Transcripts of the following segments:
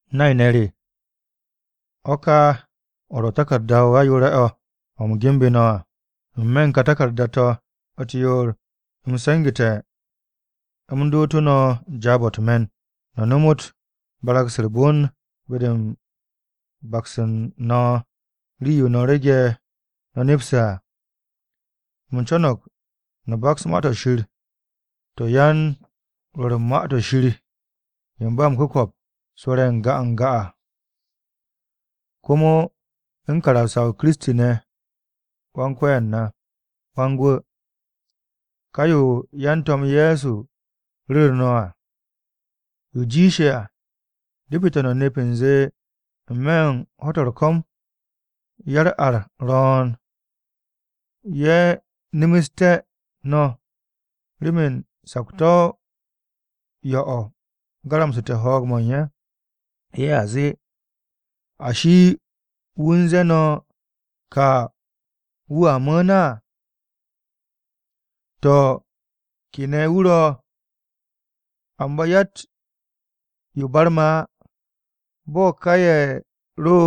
Nay-ne̱ re, o̱ ka o̱ ro̱ taku̱rda-o ayoore̱-o̱, o̱ u̱m genbu̱ no̱ à. N-me̱ u̱n ká taku̱rda-to̱ u̱t-yoor, u̱m se̱ngu̱te̱, u̱m dootu̱ no̱ jaab-o̱ u̱t-me̱n, no̱ nomot barag-se u̱r-bon be-de u̱n bakse̱ u̱n no̱ rii-yo no̱ rege̱ no̱ nepse̱ à. U̱m co̱no̱g no̱ baks Ma-to̱ Shir to̱ yan-Rwo̱r u̱n Ma-to̱ Shir ye̱ u̱n ba m-ku̱ko̱p rwo̱re̱ n-ga n-ga à, komo u̱n karamsa-o Kiristi ne̱ Wan-Ko̱yan na, Wan-Gwu̱, ká yo yan-To̱m Ye̱so ru̱ru̱ no̱ à. Yo jiishe̱ à, depete̱ no̱ nep u̱nze n-me̱ u̱n ho̱-to̱ u̱r-ko̱m, ya-u̱r-ar ro̱o̱n, ye̱ nemestú̱ no̱ remen sakto̱-o yo̱-o̱ garamsu̱te̱ ho̱o̱g-mo̱ u̱n ye̱. Ye̱a zee, “¿Ashi wu̱ u̱n ze̱e̱ no̱ ka wu̱a mu̱u̱n à? To̱, ¿ke ne̱ wu̱ ro̱? Amba yatt-yo barme̱ á bo̱ ka ye̱ ro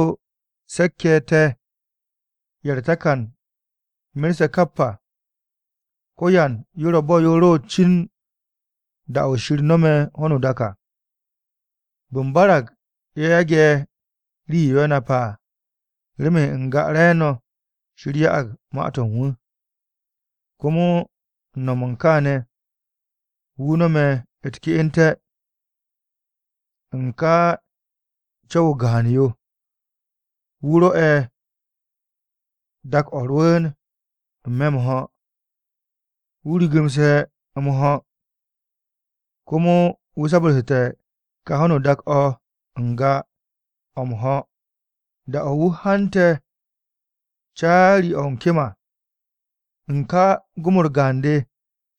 se̱k-ye̱ te̱ ye̱ u̱r-takan merse̱ kap à. Ko̱yan yo ro̱ bo̱ yo ro cin da-o̱ Shir no̱me̱ ho̱no o-dak à!” Bu̱nbarag ye̱ yage̱ rii-yo ye̱ nepse̱ à. Remen n-ga re̱e̱no̱ Shir ya'ag ma-to̱ u̱n wu̱. Komo u̱n no̱m u̱n kaane̱, wu̱ no̱me̱ u̱t-ke'ente̱. U̱n ka co̱w-o gaan-yo, wu̱ rwo̱'e̱ dak-o̱ rwu̱u̱n n-me̱ m-ho̱, wu̱ rigimse̱ o̱ m-ho̱. Komo wu̱ sabarsu̱te̱ ka ho̱no o-dak o̱ n-ga o̱ m-ho̱, da-o̱ wu̱ hante̱ caari-o̱ u̱n kem à. U̱n ká gom-u̱r gaan-de,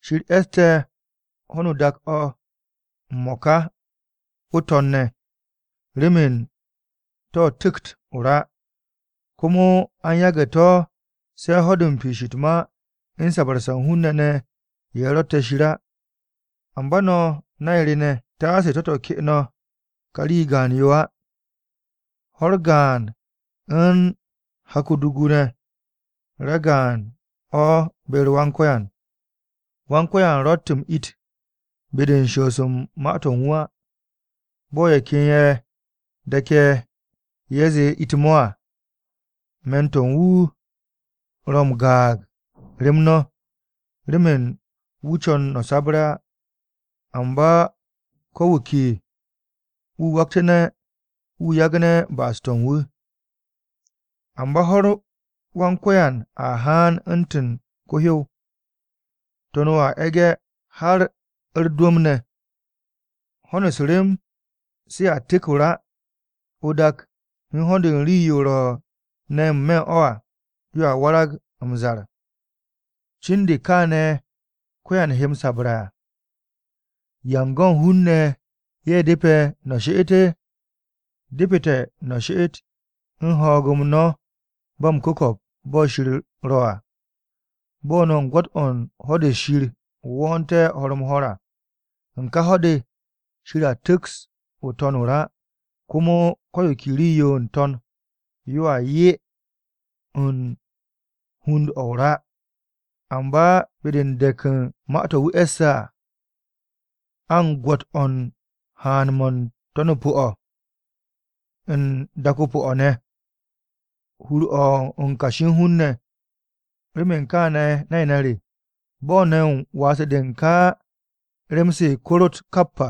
Shir e̱ste̱ ho̱no o-dak o̱ m-mo̱ka o̱ o-To̱n ne̱ remen to̱ tu̱kt o-ra, komo a u̱n yagu̱ to̱ se̱ ho̱-de u̱n piish u̱t-ma u̱n sabarse̱ u̱n hun-ne̱ ne̱ ye̱ ro̱tte̱ Shir á. Amba no̱ nay-ne̱ re taase to̱-to̱ ke no̱ kà rii gaan-yo á. Ho̱-u̱r gaan u̱n hak o-dugu ne̱ ragaan o̱ be-u̱r Wan-Ko̱yan. Wan-Ko̱yan ro̱tt m-it be-de u̱n shoos u̱n ma-to̱ u̱n wu̱ á, bo̱ ye̱ ken ye̱ de̱ke̱ ye̱ zee it-mo̱ à. Me̱n-to̱ wu̱ ro̱ m-gaag rem no̱, remen wu̱ co̱n no̱ sabre̱ á, amba ko̱ wu̱ ke wu̱ waktu̱ne̱, wu̱ yagne̱ ba'as-to̱ u̱n wu̱. Amba ho̱-u̱r Wan-Ko̱yan a haan u̱ntu̱n ko-hyow. To̱n-o a e̱ge̱ har u̱r-dwu̱m ne̱, ho̱n u̱s-rem se a tu̱k o-ra, o-dak u̱n ho̱n u̱n rii-yo ro̱ ne̱ n-me̱ u̱n o̱ à yoa warag m-zar. Cin de̱ kaane̱ ko̱yan he m-sabre̱ à, ¿Yan go̱ u̱n hun-ne̱ ye̱ depe̱ no̱ she'et? Depete̱ no̱ she'et u̱n ho̱o̱g-m no̱ ba m-ku̱ko̱p bo̱ Shir ro̱ à. Bo̱ no̱ u̱n gwo̱t-o̱ u̱n ho̱-de Shir wo̱o̱nte̱ ho̱r-m-ho̱r à, u̱n ká ho̱-de Shir a tu̱ks o-To̱n o-ra, komo ko̱ yo ke rii-yo n-To̱n yoa yee̱ u̱n hund-o̱ o-ra. Amba be-de u̱n dek u̱n ma-to̱ wu̱ e̱sse̱ à, a u̱n gwo̱t-o̱ u̱n haan-mo̱ u̱n To̱n-o pu̱-o̱ u̱n dak-o pu̱-o̱ ne̱, hur-o̱ u̱n kashi u̱n hun-ne̱. Remen kaane̱ nay-ne̱ re, bo̱ no̱ u̱n waase̱-de u̱n ka rem-se korot kap à,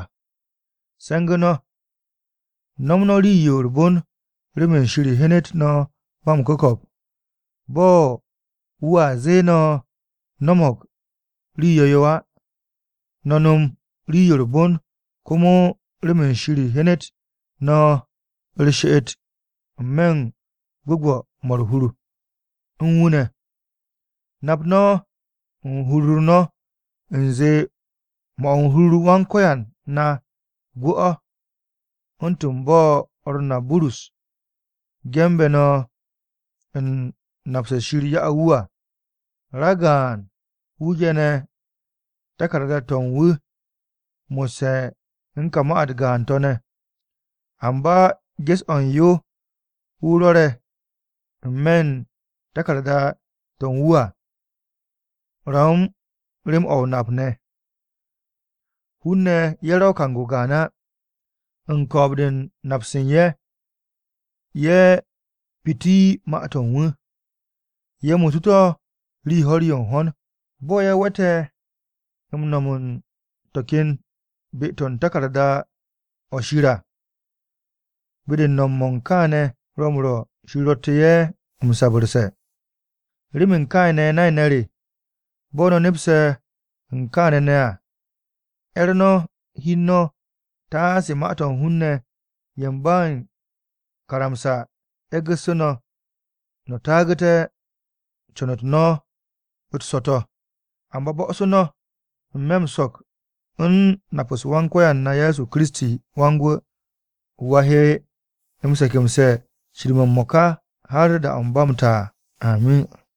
se̱ngu̱ no̱. No̱ nom rii-yo u̱r-bon remen Shir hyenet no̱ ba m-ku̱ko̱p. Bo̱ wu̱a zee no̱ no̱mo̱g rii yo̱-yo á. No̱ nom rii-yo u̱r-bon komo remen Shir hyenet no̱ u̱r-she'et n-me̱ m-gwu̱gwu̱ mo̱ u̱r-hur u̱n wu̱ ne̱. Nap no̱ u̱n hur-u̱r no̱ u̱nze 'mo̱ u̱n hur-u̱r Wan-Ko̱yan na gwu̱-o̱, u̱ntu̱n bo̱ o̱r na Burus ge̱nbe̱ no̱ u̱n nap-se Shir ya'u̱ wu̱ à. Ragaan-wu̱ ge̱ne̱ taku̱rda-to̱ u̱n wu̱ mo̱sse̱ u̱n ká ma-u̱t gaan-to̱ ne̱. Amba ges-o̱ u̱n yo wu̱ rwo̱re̱ n-me̱ u̱n taku̱rda-to̱ u̱n wu̱ à ro̱ u̱n rem-o̱ m-nap ne̱. Hun-ne̱ ye̱ ro̱ kang-o gaan á, u̱n ko̱o̱b-de u̱n nap-se u̱n ye̱, ye̱ piti ma-to̱ u̱n wu̱, ye̱ muutu̱ to̱ rii ho̱r-yo n-ho̱n, bo̱ ye̱ we̱te̱ m-no̱m u̱n to̱ ken be-to̱ u̱n taku̱rda-o̱ Shir à. Be-de u̱n no̱m-mo̱ u̱n kaane̱ ro̱ m-rwo̱ Shir ro̱tte̱ ye̱ m-sabarse̱. Remen kaane̱ nay-ne̱ re, bo̱ no̱ nepse̱ u̱n kaane̱ ne̱ à, 'er no̱ hi u̱n no̱ taase ma-to̱ u̱n hun-ne̱ ye̱ u̱n ba o-karamsa e̱gu̱sse̱ no̱ no̱ taagu̱te̱ u̱n con-u̱t no̱ u̱t-so̱to̱. Amba bo̱'o̱su̱ no̱ n-me̱ m-so̱k u̱n nap-u̱s Wan-Ko̱yan na Ye̱so KiristiWan-Gwu̱. Wu̱ a he m-se̱ke̱mse̱ cir-mo̱ m-mo̱ka har da-o̱ ba m-ta à. Amin.